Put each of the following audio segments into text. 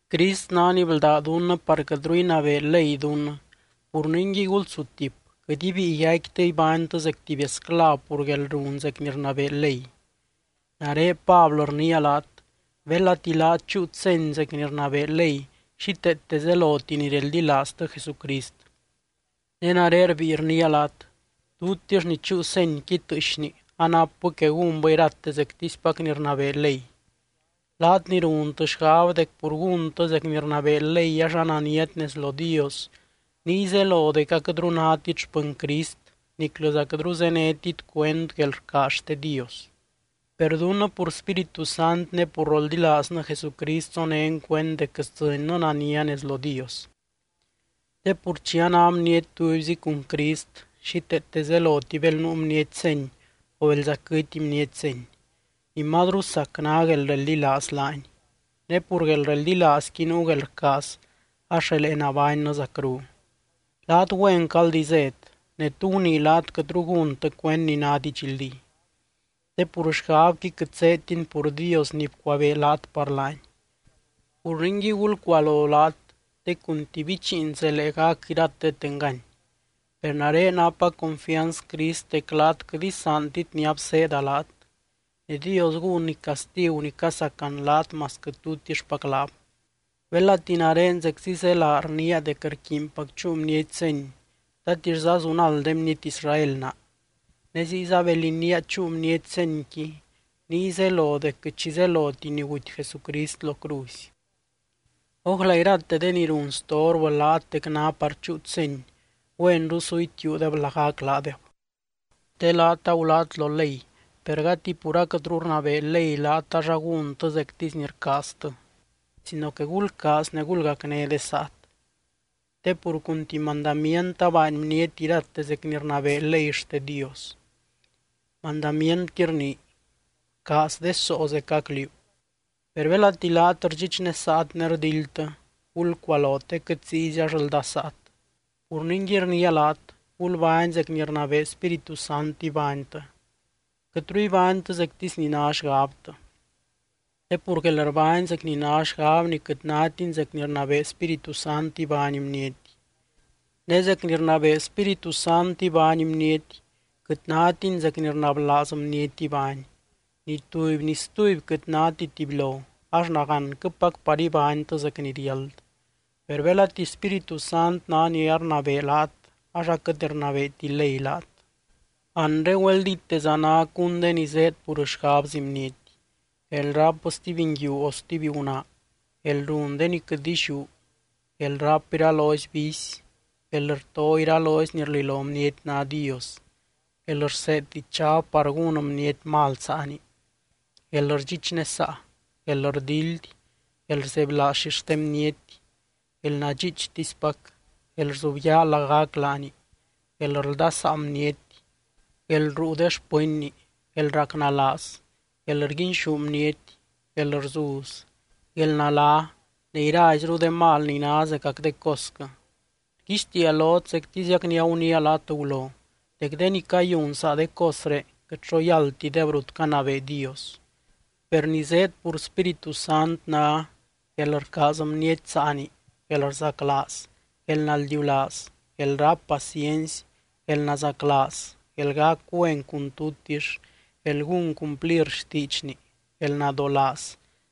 Crist ná ni bldá dunnɨ par quɨtru inabee ley dunnɨ. Pur ningui, gulsutip, quɨt ibíi yaicquitɨ ibánytɨ zec tuby esclav pur guelrun zec ni rnabee ley. Nare Pablɨ rniia laat: belati laat chúut seny zec ni rnabee ley, xíteete zeloti ni reldilaaztɨ Jesucrist. Ne nare rbíi rniia laat: tutix ni chúu senyqui tɨɨxni anapbɨ que gúnbɨ irate zectispac ni rnabee ley. Laat ni runtɨ xgab dec pur gúntɨ zec ni rnabee ley ax ananiat nez lo Dios, niy zelo dec aquɨtru nátit xpɨny Crist niclɨza quɨtru zénetit cuend guelrcaaz xte Dios. Per dunnɨ pur Spíritu Sant ne pur roldilaaznɨ Jesucrist zonén cuend dec sdzɨnnɨ nania nez lo Dios. Te pur chi a ná bniety tubyzi cun Crist xíteete zeloti bel nuu bniety seny o belza quɨty bniety seny. Ni mazru sac ná guelreldilaaz laany. Ne pur guelreldilaazqui nuu guelrcaaz ax relee nabánnɨ zacru. Laat güenquɨ aldi zét. Ne, ¿tú gunii laat quɨtru gúntɨ cuend ni ná didxldí? Te pur xgabqui quɨt zéedtini pur Dios ni bcuabee laat par laany. Pur ningui, gulcualo laat te cun tuby bichiin zelee gac iratet engany. Per nare napa confianz Crist dec laat quɨt isaantit ni abseeda laat. Ne Dios gúnny castigu ni casacan laat masquɨ tutixpac laab. Belati nare zeczi zélaa rniia dec rquiinpac chúu bniety seny, ¿tatixza zunald de bniety Israel naa? Ne ziyza bel iniia chúu bniety senyqui niy zelo dec quɨt xi zeloti ni guty Jesucrist lo cruzy. ¡Ójla irate de ni run storbɨ laat dec ná par chúut seny, güenru su itiuudeb lagac laadeb! Te laat agulát lo ley, per gati pur aquɨtru rnabee ley laat ax agúntɨ zectisy ni rcaaztɨ, sino que gulcaaz ne gulgacné de saat. Te pur cun tuby mandamient abaany bniety irate zec ni rnabee ley xte Dios. Mandamientqui rnii: “Bcaaz de soo zecac liú.” Per belati laat rdxichnesaat ne rdildtɨ, gulcualo te quɨt ziyzi ax aldasaat. Pur ningui, rniia laat: Gulbány zec ni rnabee Spíritu Sant ibánytɨ. Quɨtru ibánytɨ zectisy ni ná xgabtɨ. Te pur guelrbány zec ni ná xgabni quɨt nátini zec ni rnabee Spíritu Sant ibány bniety. Ne zec ni rnabee Spíritu Sant ibány bniety quɨt nátini zec ni rnablaaz bniety ibány. Ni tuby ni stuby quɨt náti tubylo, ax nagánquɨpac par ibánytɨ zec ni riáld. Per belati Spíritu Sant ná ni arnabee laat ax aquɨt rnabeeti ley laat. Anre güeldíteza ná cún de ni zéed pur xgabzi bniety: guelráp stuby nguiu o stuby gunaa, guelrun de ni quɨt illiú, guelráp iralozy vicy, guelrto iralozy ni rlilo bniety ná Dios, guelrseed dichab par gún bniety mal saani, guelrdxichnesaa, guelrdildy, guelrzebylaaz xixte bniety, guelnadxiichtispac, guelrzubyaa lagac laani, guelrldasaa bniety, guelruu de xpɨnni, guelracnalaaz, guelrguinxú bniety, guelrzuz, guelnalá ne iraizru de mal ni ná zecac de cosquɨ. Rguixtiia lot zectiziac ni aguniia laat gulo, dec de ni cayun saa de cosré quɨt xo yáldtideb rut canabee Dios. Per ni zéed pur Spíritu Sant ná: guelrcaaz bniety saani, guelrzaclaaz, guelnaldiulaaz, guelráp paciency, guelnazaclaaz, guelgac güen cun tutix, guelgún cumplir xtiidxni, guelnadolaaz,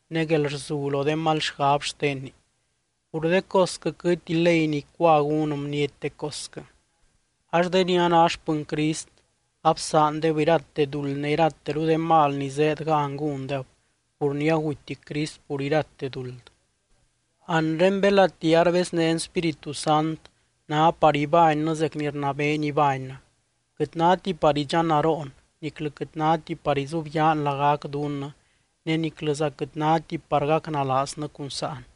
ne guelrzu lo de mal xgab xtenni. Pur de cosquɨ quɨtti ley ni icua gún bniety de cosquɨ. Ax de ni a ná xpɨny Crist absaandeb irate duld ne irateru de mal ni zéed gan gúndeb, pur ni aguty Crist pur irate duld. Anre belati arbeznén Spíritu Sant ná par ibánnɨ zec ni rnabeeny ibánnɨ. Quɨt náti par idxannaroon, niclɨ quɨt náti par izubyaan lagac dunnɨ ne niclɨza quɨt náti par gacnalaaznɨ cun sáan.